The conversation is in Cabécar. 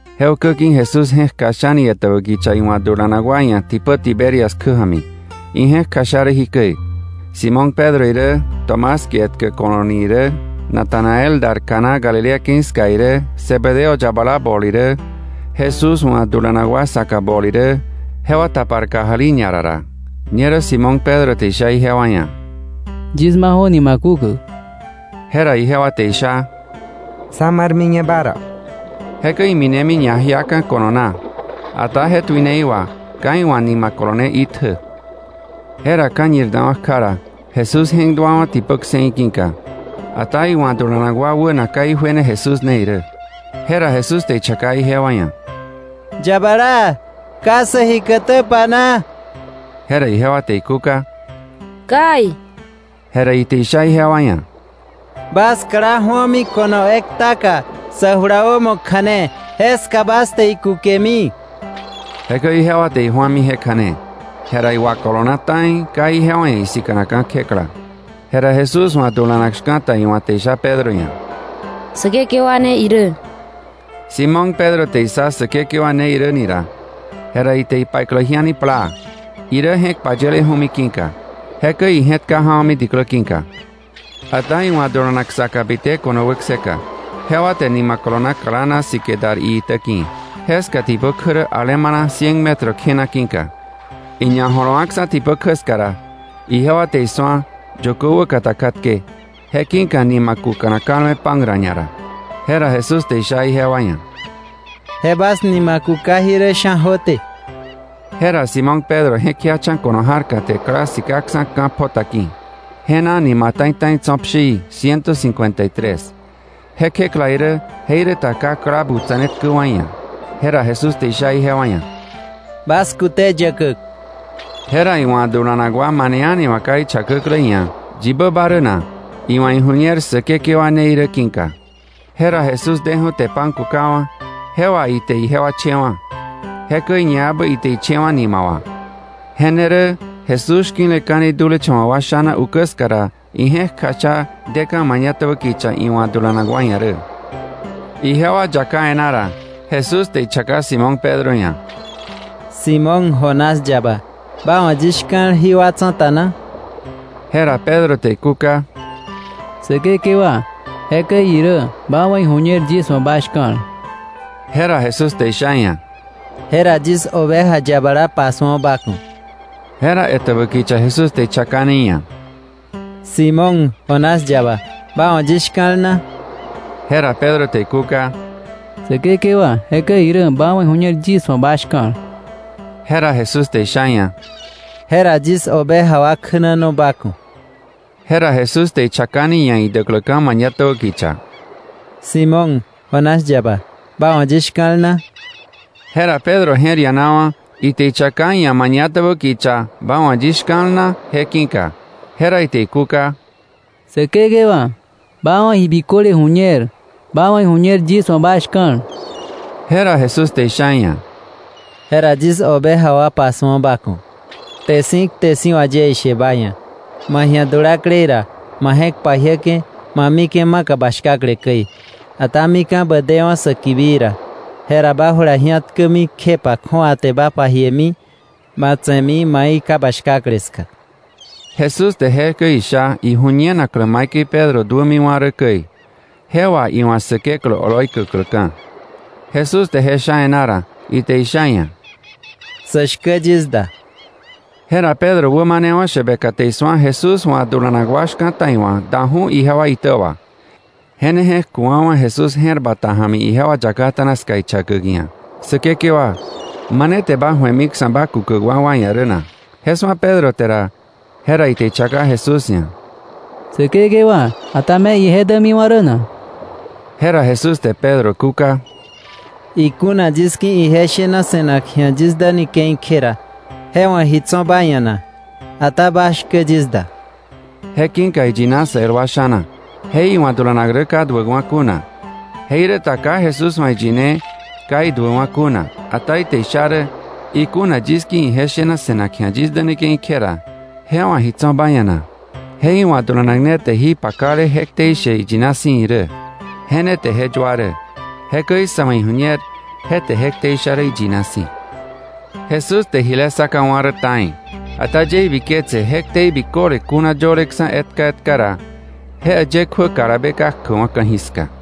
Je ukä ki̱ Jesús je̱k kjashani etäbä kicha iwa̱ dulanak wa ia̱ tipä Tiberias kjä ja̱mi. Ije̱k kjasha rä jikäi: Simón Pedro irä, Tomás kie etkä Ko̱lo̱ ni irä, Natanael dar Caná Galilea ke̱i ska irä, Zebedeo yabala bol irä, Jesús wa̱ dulanak wa saka bol irä, jewa tapar kajali ñara ra. Ñerä Simón Pedro te isha ijewa ia̱: —Yis maju̱ nima kukäk. Jera ijewa te isha: —Sá marmiña ba ra. Jekäi iminemi ñajiaka̱ ko̱no na. Ata je tuinei wà ka iwa̱ nima kolone itjä. Jera ka̱ñir dawa̱ kja ra, Jesús je̱k duawa̱ tipä kse̱i ki̱ka. Ata iwa̱ dulanak wa wäna ka ijuene Jesús ne irä. Jera Jesús te ichaka ijewa ia̱: —Yabala, ¿ka sä ji kätäpa na? Jera ijewa te ikúka: —Kai. Jera ite isha ijewa ia̱: —Bas kla ju̱omi ko̱no ektaka sä jula wämo kja̱ne. Jeska bas te ikukemi. Jekäi ijewa te iju̱ami je kja̱ne. Jera iwakolona ta̱i ka ijewa ia̱ isika̱nakka̱ kjekla. Jera Jesús wa̱ dulanak shka̱ta iwa̱ te isha Pedro ia̱: —¡Säkekewa ne irä! Simón Pedro te issa Säkekewa ne irä ni ra, jera ite ipaiklä jiani plaa, irä je̱k payeleju̱mi ki̱ka. Jekäi ije̱tka ja̱wa̱mi diklä ki̱ka. Ata iwa̱ dulanak saka bite ko̱no wäkseka. Jewa te nima kolona kla na sike dar iitä ki̱, jeska tipä kjä rä alemana cien metro kjena ki̱ka. Iñajolowa̱ksa̱ tipä kjä ska ra, ijewa te isu̱a yökö wäkata katke, je ki̱ka nima kuka̱na kalme pan ra ñara. Jera Jesús te isha ijewa ia̱: —Je bas nima kuka jirä sha̱ jöté. Jera Simón Pedro je̱k jiacha̱ ko̱no ja̱rka te kla sikaksa̱ ka̱ pjota ki̱. Je na nima ta̱i ta̱i tso̱ pshii ciento cincuenta y tres. Je kjekla irä jeiräta ka kla butsa̱ne tkäwa̱ iia̱. Jera Jesús te isha ijewa ia̱: —Bas kute yäkäk. Jera iwa̱ dulanak wa mane a̱ni wa̱ ka ichakäklei iia̱: “¿Yi ba rä na?”, iwa̱ iju̱ñer Säkekewa ne irä ki̱ka. Jera Jesús deju̱ te pan kukawa̱, je wà ite ijewa chewa̱, jekäi ñaebä ite ichewa̱ nima wà. Je ne rä Jesús shki̱leka̱ni dulecha̱wa̱ wa sha̱na ukä ska ra ije̱k kjasha deka̱ mañatäbä kicha iwa̱ dulanak wa ia̱ rä. Ijewa yaká e̱ná ra, Jesús te ichaka Simón Pedro ia̱: —Simón, Jonás yaba, ¿ba wa̱ yis shka̱l jí wa tsa̱ta na? Jera Pedro te ikúka: —Säkekewa, jekäi irä. Ba wa̱ iju̱ñer yis wa̱ ba shka̱l. Jera Jesús te isha iia̱: —Jera yis oveja yabala pasu̱o ba ku̱. Jera etäbä kicha Jesús te ichakani iia̱: —Simón, Jonás yaba, ¿ba wa̱ yis shka̱l na? Jera Pedro te ikúka: —Säkekewa, jekäi irä. Ba wa̱ iju̱ñer yis wa̱ ba shka̱l. Jera Jesús te isha iia̱: —Jera yis oveja wa kjänano ba ku̱. Jera Jesús te ichakani iia̱ idäkläka̱ mañatäbä kicha: —Simón, Jonás yaba, ¿ba wa̱ yis shka̱l na? Jera Pedro je̱r ianawa̱, ite ichaka iia̱ mañatäbä kicha: “¿Ba wa̱ yis shka̱l na?” je ki̱ka. Jera ite ikúka: —Säkekewa, ba wa̱ ji biköle ju̱ñer. Ba wa̱ iju̱ñer yis wa̱ ba shka̱l. Jera Jesús te isha iia̱: —Jera yis oveja wa pasu̱o ba ku̱. Kte si̱ kte si̱ wà yie ishe ba ia̱, ma ji̱a dulaklei ra, ba je̱k pajiäke̱ ma mike̱ maka ba shkakle käi; ata mika̱ bä dewa̱ säkibii ra, jera ba jula ji̱atkämi jekjepa kju̱awa te ba pajiemi ba tse̱mi mai ka bä shkakle ska. Jesús te jekäi isha iju̱ñenaklä maikäi Pedro duämiwa̱ rä käi, je wà iwa̱ Säkeklä oloi käkläka̱. Jesús te je sha e̱ná ra, ite isha iia̱: —¡Sä shkä yis da! Jera Pedro wämanewa̱ shäbeka te isu̱a Jesús wa̱ dulanak shka̱ta iwa̱ daju̱ ijewa itä wà. Je ne je̱k ku̱wa̱wa̱ Jesús je̱r bata ja̱mi ijewa yakata̱na ska ichakäk iia̱: “Säkekewa, ¿mane te ba ju̱emiksa̱ ba kukäkwa̱ wa ia̱ rä na?” Je su̱a Pedro te ra, jera ite ichaka Jesús ia̱: —Säkekewa, ¿ata me ije dämiwa̱ rä na? Jera Jesús te Pedro kúka: —Ikuna yis ki̱ ije shena se̱nak ji̱a yis däni ke̱i kje ra, ¿je wa̱ ji tso̱ ba ia̱ na? Ata ba shkä yis da. Je ki̱ka iyina sä el wa sha̱na, je iwa̱ dulanak rä ka duäkwa̱ kuna. Jeiräta ka Jesús wa̱ iyine ka iduäkwa̱ kuna, ata ite isha rä: “Ikuna yis ki̱ ije shena se̱nak ji̱a yis däni ke̱i kje ra, ¿je wa̱ ji tso̱ ba ia̱ na?” Je iwa̱ dulanak ne te jí ipakale je ktei she iyina si̱ irä. Je ne te je yua rä. Jekäi sa̱ wa̱ iju̱ñer je te je ktei sha rä iyina si̱. Jesús te jile saka wá̱ rä ta̱i. Ata yie ibiketse je ktei biköle kuna yöleksa̱ etka etka ra, je äyë kjuä kalabe ka kjäkwa̱ ka̱jiska.